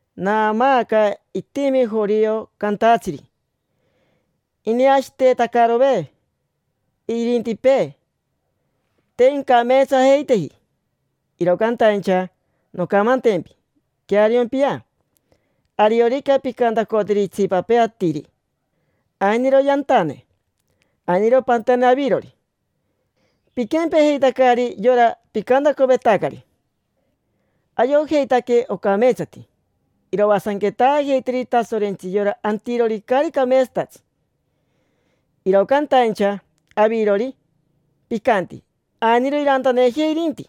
Naamaaca itimi jorio cantatsiri: “Ineashiitetacarove irintipee, te incameetsajeiteji”. Iro cantaincha noncamantempi; queariompia, ariorica pincantacoteri itsipapee atiri: “Ainiro yantane”, ainiro pantane avirori, piquempejeitacari yora picantacovetacari. Ayojeitaque ocameetsati iroasanquetaajeiteri Tasorentsi yora antirori caari cameetsatatsi. Iro cantaincha avirori, picanti: “Ainiro irantanejei irinti”,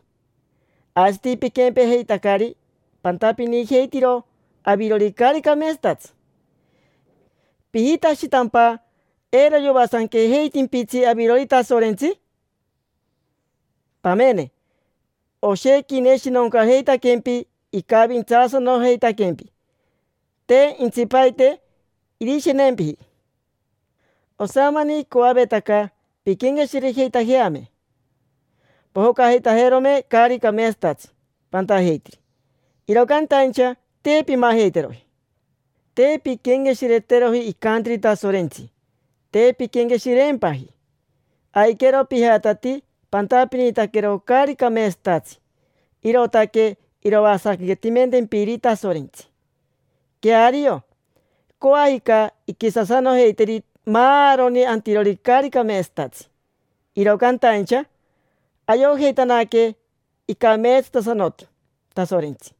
aisati piquempejeitacari, pantapinijeitiro avirori caari cameetsatatsi. ¿Pijitashitampa eiro yoasanquejeitimpitsi avirori Tasorentsi? Pamene, oshequi ineshinoncajeitaquempi, icavintsaasanojeitaquempi, te intsipaite irishemempi: osamani icoavetaca pinquenqueshirejeitajeame, pojocajeitajerome caari cameetsatatsi pantajeitiri. Iro cantaincha, te pimajeiteroji. Te pinquenqueshireteroji icantiri Tasorentsi, te pinquenqueshireempaji. Aiquero pijatatii pantapinitaquero caari cameetsatatsi, irootaque iroasanquetimentempiri Tasorentsi. Queario, coajica inquisasanojeiteri maaroni antirori caari cameetsatatsi. Iro cantaincha ayojeitanaque icameetsatasanoti Tasorentsi,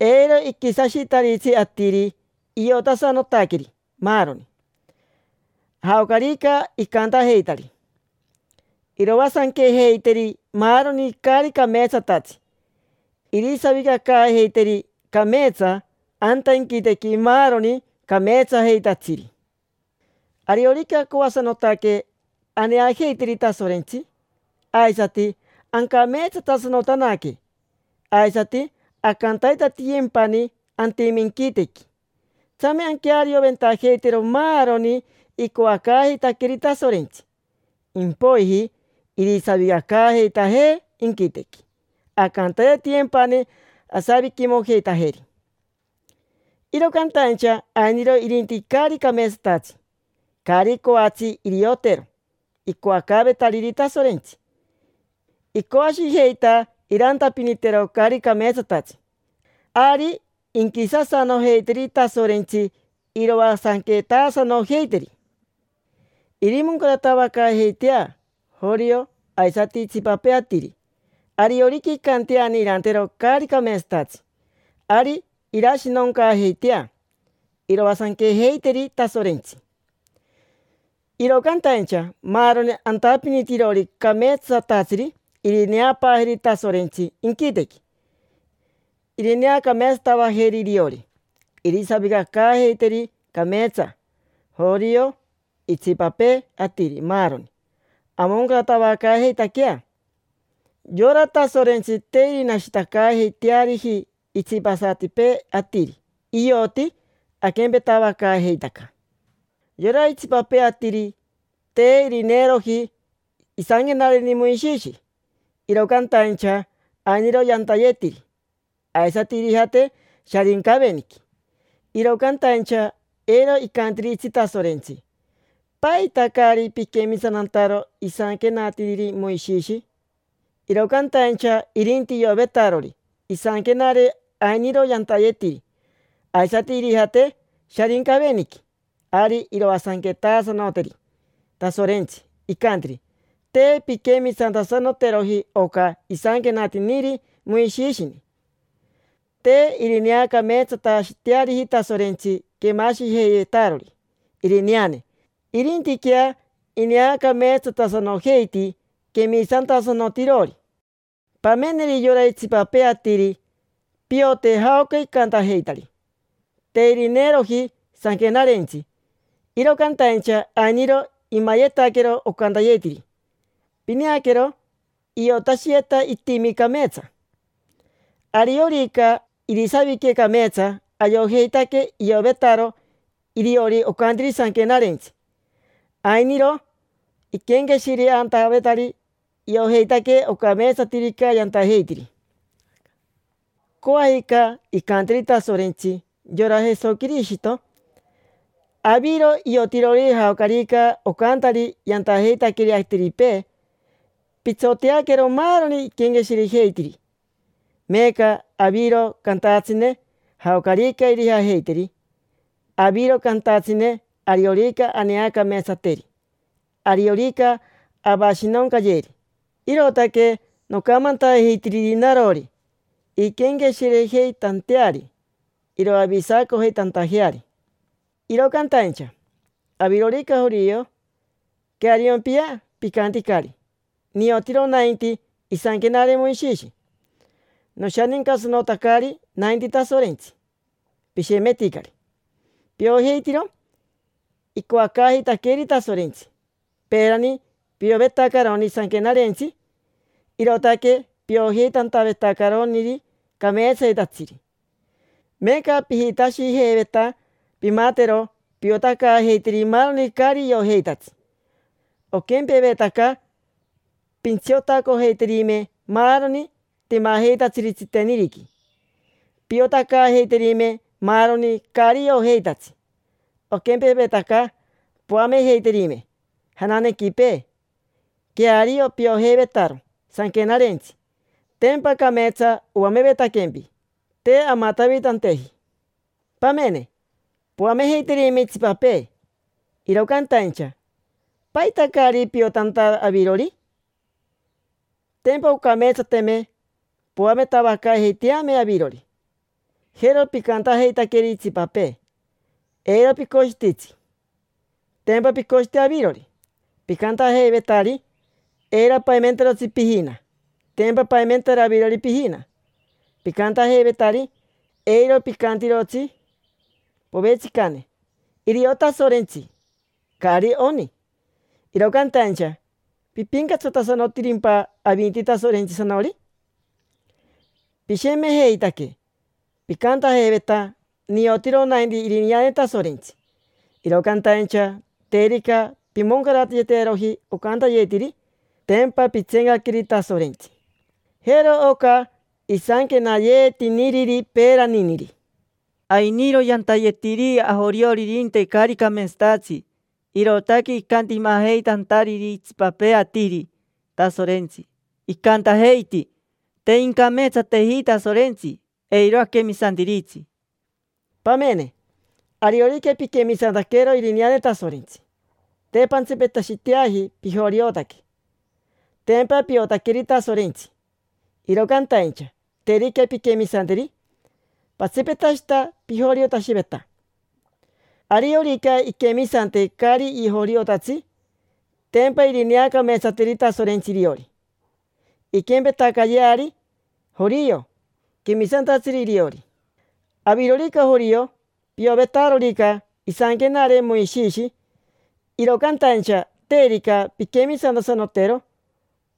eiro iquisashitaritsi atiri, iotasanotaqueri maaroni, jaocarica icantajeitari. Iroasanquejeiteri maaroni caari cameetsatatsi, irisavicacaajeiteri cameetsa anta inquitequi maaroni cameetsajeitatsiri. Ariorica acoasanotaque aneajeiteri Tasorentsi aisati ancameetsatasanotanaque, aisati ancantaitatiyempani antime inquitequi, tsame anquearioventajeitero maaroni icoacaajeitaqueeri Tasorentsi. Impoiji irisavicacaajeitajee inquitequi, ancantaitatiyempani asaviquimojeitajeri. Iro cantaincha ainiro irinti caari cameetsatatsi, caari coatsi iriotero icoacaavetariri Tasorentsi: icoashijeita irantapinitero caari cameetsatatsi. Ari inquisasanojeiteri Tasorentsi, iroasanquetasanojeiteri. Irimoncaratavacaajeitea jorio aisati itsipapee atiri: ariorica incanteani irantero caari cameetsatatsi, ari irashinoncaajeitea, iroasanquejeiteri Tasorentsi. Iro cantaincha maaroni antapinitirori cameetsatatsiri irineapaajeri Tasorentsi inquitequi, irineacameetsatavajeri iriori, irisavicacaajeiteri cameetsa: jorio, itsipapee atiri, maaroni. Amoncaratavacaajeitaquea. Yora Tasorentsi te irinashitacaajeiteariji itsipasatipee atiri: ioti aquempetavacaajeitaca. Yora itsipapee atiri te irineeroji isanquenareni Moishishi, iro cantaincha ainiro yantayetiri, aisati irijate Sharincaveniqui. Iro cantaincha eiro icantiritsi Tasorentsi: “¿Paita caari piquemisantantaro isanquenatiri Moishishi?” Iro cantaincha irinti iovetarori isanquenare ainiro yantayetiri, aisati irijate Sharincaveniqui; ari iroasanquetasanoteri Tasorentsi, incanteri: “Te pinquemisantasanoteroji oca isanquenatiniri Moishishini”. Te irineacameetsatashiteariji Tasorentsi quemashijeivetarori irineane, irintiquea ineacameetsatasanojeiti quemisantasanotirori. Pameneri yora itsipapee atiri, piote jaoca icantajeitari. Te irineeroji Sanquenarentsi, iro cantaincha ainiro imayetaquero ocantayetiri. Pineaquero, iotashiyeta itimi cameetsa. Ariorica irisavique cameetsa, ayojeitaque iovetaro iriori ocantiri Sanquenarentsi. Ainiro iquenqueshireantavetari: iojeitaque ocameetsatirica yantajeitiri. Coajica incanteri Tasorentsi yora Jesoquirishito: “Aviro iotirori jaocarica ocantari yantajeitaqueri atiripee, pitsoteaquero maaroni iquenqueshirejeitiri. Meeca aviro cantatsine jaocarica irijajeiteri. Aviro cantatsine ariorica aneacameetsateri, ariorica avashinoncayeri”. Irootaque nocamantajeitiriri narori, inquenqueshirejeitanteari, iroavisacojeitantajeari. Iro cantaincha, avirorica jorio, queariompia. Picanticari: “Niotiro nainti isanquenare Moishishi. Noshanincatasanotacari nainti Tasorentsi”. Pishemeticari. Piojeitiro icoacaajeitaqueeri Tasorentsi. Peerani piovetacaroni Sanquenarentsi, irootaque piojeitantavetacaroniri cameetsayetatsiri. Meeca pijitashijeiveta pimatero piotacaajeiteri maaroni caari iojeitatsi. Oquempevetaca pintsiotacojeiterime maaroni timajeitatsiri tsiteniriqui. Piotacaajeiterime maaroni caari iojeitatsi, oquempevetaca poamejeiterime jananequipee. Queario piojeivetaro Sanquenarentsi, tempa cameetsa oamevetaquempi, te amatavitanteji. Pamene, poamejeiterime itsipapee, iro cantaincha ¿paita caari piotanta avirori? Tempa oncameetsateme poametavacaajeiteame avirori. Jero picantajeitaqueri itsipapee: “Eiro picoshititsi”. Tempa picoshiti avirori. Picantajeivetari: “Eiro paimentarotsi pijina”. Tempa paimentaro avirori pijina. Picantajeivetari: “Eiro picantirotsi povetsicane: ‘Irio Tasorentsi’. Caari oni”. Iro cantaincha ¿pipincatsatasanotirimpa avinti Tasorentsisanori? Pishemejeitaque, picantajeiveta: “Niotiro nainti irineane Tasorentsi”. Iro cantaincha terica pimoncarayeteroji ocantayetiri, tempa pitseencaqueri Tasorentsi. Jero oca isanquenayeetiniriri peeraniniri: “Ainiro yantayetiri ajorioririnte caari cameetsatatsi, irootaque icantimajeitantariri itsipapee atiri Tasorentsi, icantajeiti: ‘Te incameetsateji Tasorentsi, eiro aquemisantiritsi’”. Pamene, ariorica piquemisantaquero irineane Tasorentsi, te pantsipetashiteaji pijoriotaque, tempa piotaqueri Tasorentsi. Iro cantaincha terica pinquemisanteri, patsipetashita pijoriotashiveta. Ariorica inquemisante caari joriotatsi, tempa irineacameetsateri Tasorentsi iriori. Inquempetacayeari jorio, quemisantatsiri iriori. Avirorica jorio, piovetarorica isanquenare Moishishi; iro cantaincha terica pinquemisantasanotero,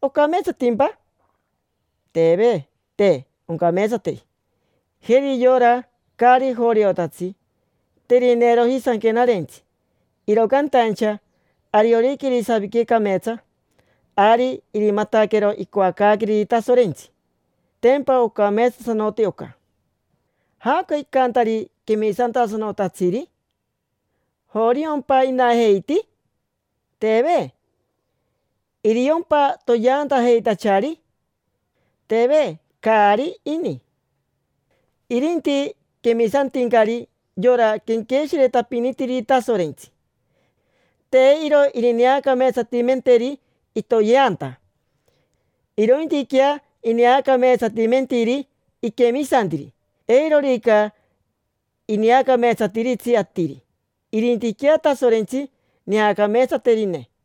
¿ocameetsatimpa? Teve, te oncameetsateji. Jeri yora caari joriotatsi: te irineeroji Sanquenarentsi, iro cantaincha ariorica irisavique cameetsa, ari irimataquero icoacaaqueriri Tasorentsi. Tempa ocameetsatasanoti oca. ¿Jaoca icantari quemisantasanotatsiri? ¿Joriompa inajeiti? Teve. ¿Iriompa toyeantajeitachari? Teve, caari ini. Irinti quemisantincari yora quenqueshiretapinitiriri Tasorentsi. Te iro irineacameetsatimenteri itoyeanta, irointiquea ineacameetsatimentiri iquemisantiri. Eirorica ineacameetsatiritsi atiri, irintiquea Tasorentsi neacameetsaterine.